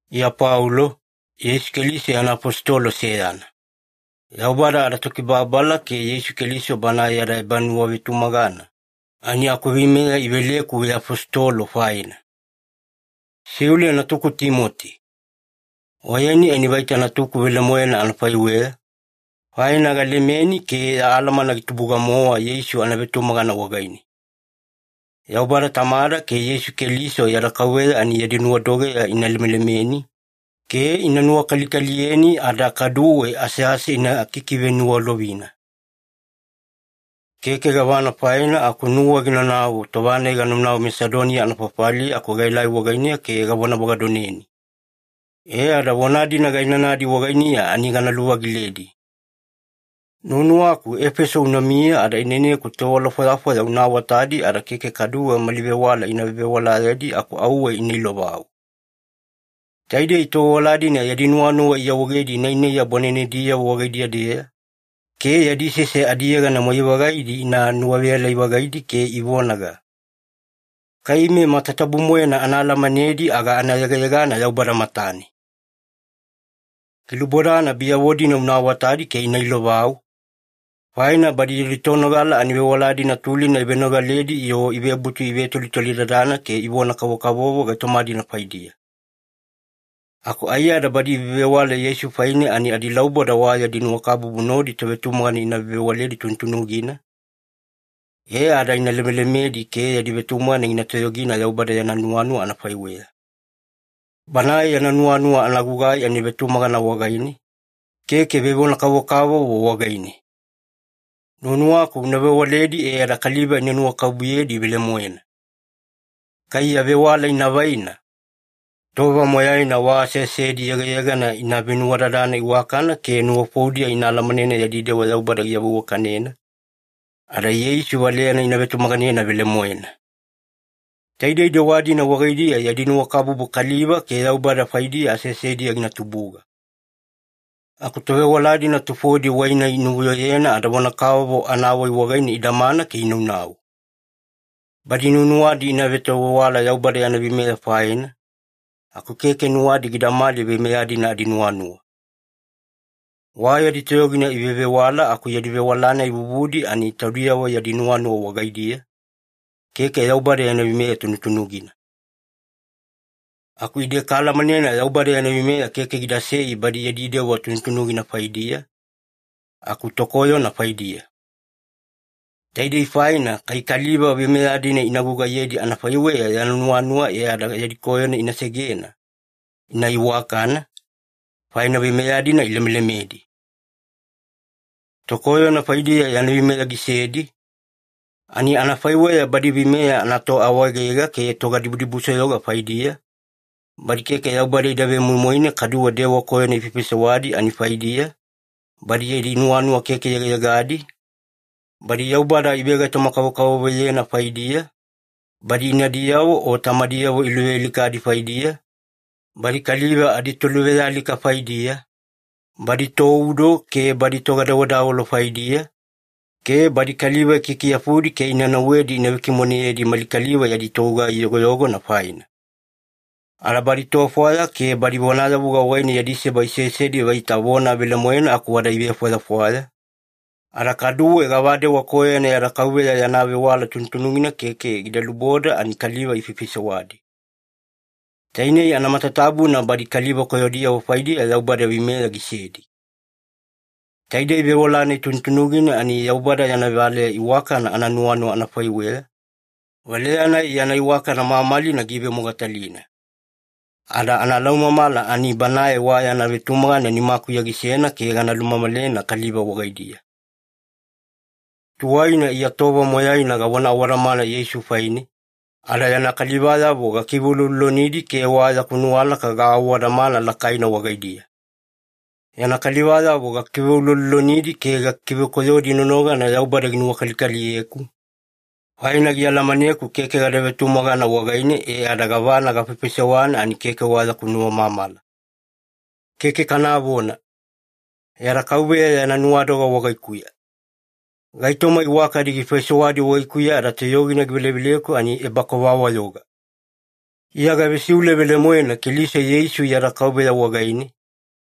Iya Paulo, Yeisu Keliso yana afositolo seyana. Yaubada adaTokibababala ke Yeisu Keliso Banae yada ebanuwavetumagana, ani akuveimeya iveleku veafositolo faina. Siule natuku Timoti. Oyeni ani vaita natuku velemoena anafaiweya, faina galemeni ke ya alamana gitubuga-mowa Yeisu anavetumagana wagaine. Yaubada Tamada ke Yeisu Keliso yada Kauveya ani yadi nuwadogeya ina lemelemeni, ke ina nuwakalikaliyeni ada kaduwe asease ina kikiveniwalovina. Keke gavana faina aku nuwa ginanau tova-nai ganaunau Masedoniya anafafaliya aku gaelai wagainiya ke gavonavagadoneni. E ada vona-dina gainanadi wagainiya ani gana luvagiledi. Nuwanuwaku Efeso unamiya ada ineneku tovewala fwayafwaya una awatadi ada keke kaduwe mali vewala ina vevewalayedi aku auwe ina ilovau. Taidei tovewala-dina yadi nuwanuwa iawaegedi nainaiya bwanenediyavo wagaidiya-deya, ke yadi sese adiyegana moyai-vagaidi ani inuwaveyalai-vagaidi ke ivonaga, “Kai ime matatabu-moena ana alamanedi aga ana yegayegana Yaubada matane.” Gilubodana biyavo-dina una awatadi ke ina ilovau, faina badi yadi tonogala ani vewala-dina tulina ivenogaledi-yo ivebutu ivetolitolidadana ke ivona-kavokavovo gaitoma-dina faidiya. Aku aiyada badi ivevewala Yeisu faine ani adilauboda wa yadi nuwakabubu nodi tovetumagana ina vevewaledi tunutunugina, e ada ina lemelemedi ke yadi vetumagana gina toyogina Yaubada yana nuwanuwa anafaiweya. Banae yana nuwanuwa anagugai ani vetumagana wagaine, keke vevonavona-kavokavovo wagaine. Nuwanuwaku una vewaledi e ada kaliva ina nuwakabubuyedi velemoena. Kai ya vewala ina vaina, tova moyaina wa aseasedi yegayegana ina venuwadadana iwakana ke nuwafoudiya ina alamanena yadi dewa Yaubada giawaveiwakanena, ada Yeisu valeyana ina vetumaganena velemoena. Taidei dewa-dina wagaidiya yadi nuwakabubu kaliva ke Yaubada faidiya aseasediya gina tubuga. Aku tovewala-dina tufodi wai-nai inuvuyoyena ada vona-kavovo anawai wagaine idamana ke inaunau. Badi nuwanuwadi ina vetovewala Yaubada yana veimeya faina, aku keke nuwadi gidamali veimeya-dina adinuwanuwa. Wa yadi toyogina ivevewala aku yadi vewala-nai vuvudi ani taudiyavo yadi nuwanuwa wagaidiya, keke Yaubada yana veimeya tunutunugina. Aku ide kaalamanena Yaubada yana veimeya keke gidasei badi yadi dewa tunutunugina faidiya, aku tokoyona faidiya. Taidei faina kai kaliva veimeya-dina ina gugaiyedi anafaiweya yana nuwanuwa e ada yadi koyona ina segena, ina iwakana, faina veimeya-dina ilemelemedi. Tokoyona faidiya yana veimeya gisedi, ani anafaiweya badi veimeya anatoawaegega ke togadibudibusoyoga faidiya, badi keke Yaubada ida vemoimoine kaduwe dewa koyona ifaifaisewadi ani faidiya, badi yadi nuwanuwa keke yegayegadi, badi Yaubada ivegaitoma-kavokavovoyena faidiya, badi inadiyavo o tamadiyavo iluvealikadi faidiya, badi kaliva aditoluvealika faidiya, badi toudo ke badi togadawedawelo faidiya, ke badi kaliva ikikiyafudi ke ina nauwedi ina vekimoneyedi mali kaliva yadi togugai yogoyogona faina. Ada badi tofwaya ke badi vonayavuga wagaine yadi seba isesedi vaita vona velemoena aku wada ivefwayafwaya, ada kaduwe gavadewa koyona yada Kauveya yana vewala tunutunugina keke gida luboda ani kaliva ifaifaisewadi. Tainei anamatatabuna badi kaliva koyodiyavo faidiya Yaubada veimeya gisedi. Taidei vewala-nai tunutunugina ani Yaubada yana valeya iwakana ananuwanuwa anafaiweya, valeya-nai yana iwakana mamalina giivemogatalina. Ada analaumamala ani Banae wa yana vetumagana nimakuya gisena ke gana lumamalena kaliva wagaidiya. Tuwaina Iya tova moyaina gavona awadamana Yeisu faine, ada yana kalivayavo gakiveuloulolonidi ke wa yaku nuwalaka gaawadamana lakaina wagaidiya. Yana kalivayavo gakiveuloulolonidi ke gakikivekoyodi nonogana Yaubada ginuwakalikaliyeku, faina gialamaneku keke gada vetumagana wagaine e ada gavana gafaifaisewana ani keke wa yaku nuwamamala. Keke kanavona! Yada KAUVEYA yana nuwadoga wagaikuya. Gaitoma iwakadi gifaisewadi wagaikuya ada toyogina giveleveleku ani ebakova-wayoga. Iya gavesiule velemoena Keliso Yeisu yada Kauveya wagaine,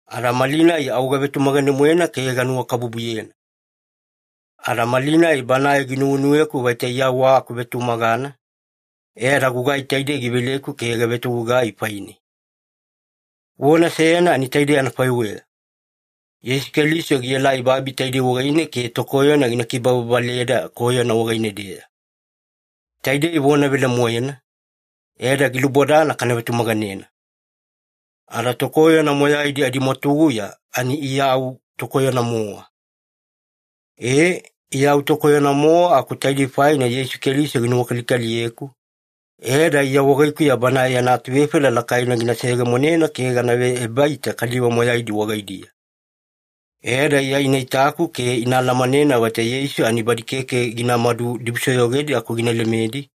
ada malinai au gavetumagane-moena ke ganuwakabubuyena. Ada malinai Banae ginuwenuweku vaita Iya wa akuvetumagana, e ada gugai taidei giveleku ke gavetogugai faine. Vona seyana ani taidei anafaiweya. “Yeisu Keliso gielai babi taidei wagaine ke tokoyona gina kibababaleda koyona wagaine-deya.” Taidei vona velemoena, e ada gilubodana kana vetumaganena. Ada tokoyona moyaidi adimwatuguya ani Iya au tokoyona-mowa. Ee, Iya au tokoyona-mowa aku taidei faina Yeisu Keliso ginuwakalikaliyeku, e ada Iya wagaikuya Banae yana atuvefaila lakaina gina seyegemonena ke gana veebaita kaliva moyaidi wagaidiya. E ada Iya ina itaku ke ina alamanena vaita Yeisu ani badi keke ginamadu dibusoyogedi aku gina lemedi,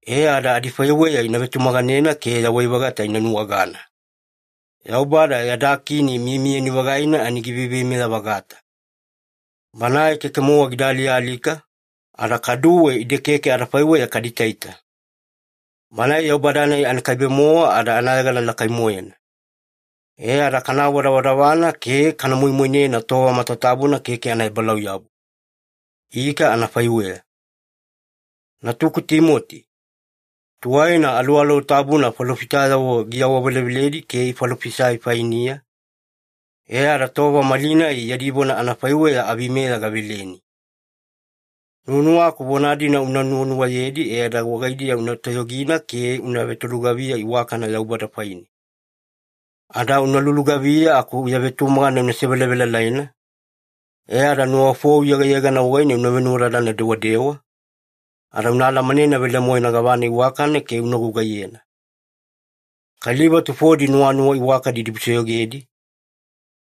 e ada adifaiweya ina vetumaganena ke yawai-vagata ina nuwagana. Yaubada yada Kini miyamiyani-vagaina ani giveiveimeya-vagata. Banae keke-mowa gida alialika, ada kaduwe ide keke adafaiweya kada itaita. Banae Yaubada-nai anakaibe-mowa ada anayegana lakai-moena. E ada kana awadavadavana ke kana moimoinena tova matatabuna keke anaebalauyabu. Ika anafaiweya. Natuku Timoti, tuwaina Aluwaluwa Tabuna falofitayavo giawaveleveledi ke ifalofisai fainiya, e ada tova malinai yadi vona anafaiweya aveimeya gaveleni. Nuwanuwaku vona-dina una nuwanuwayedi e ada wagaidiya una toyogina ke una vetolugaviya iwakana Yaubada faine. Ada una lulugaviya aku ya vetumagana una sevelavelalaina, e ada nuwafou yegayegana wagaine una venuwadadana dewadewa, ada una alamanena velemoena gavana iwakana ke una gugaiyena. Kaliva tufodi nuwanuwa iwakana idibusoyogedi,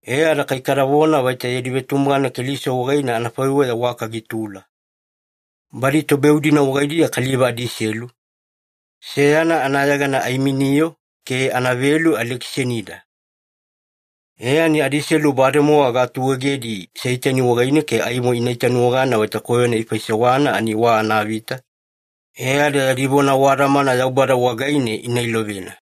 e ada kai kadavona vaita yadi vetumagana Keliso wagaine anafaiweya waka gitula. Badi tobeu-dina wagaidiya kaliva adiselu, seyana anayegana Aiminio ke anavelu Alekisanida. E ani adiselu bademowa gaatuegedi Seitani wagaine ke aimo ina itanuwagana vaita koyona ifaisewana ani wa anavita, e ada yadi vona awadamana Yaubada wagaine ina ilovena.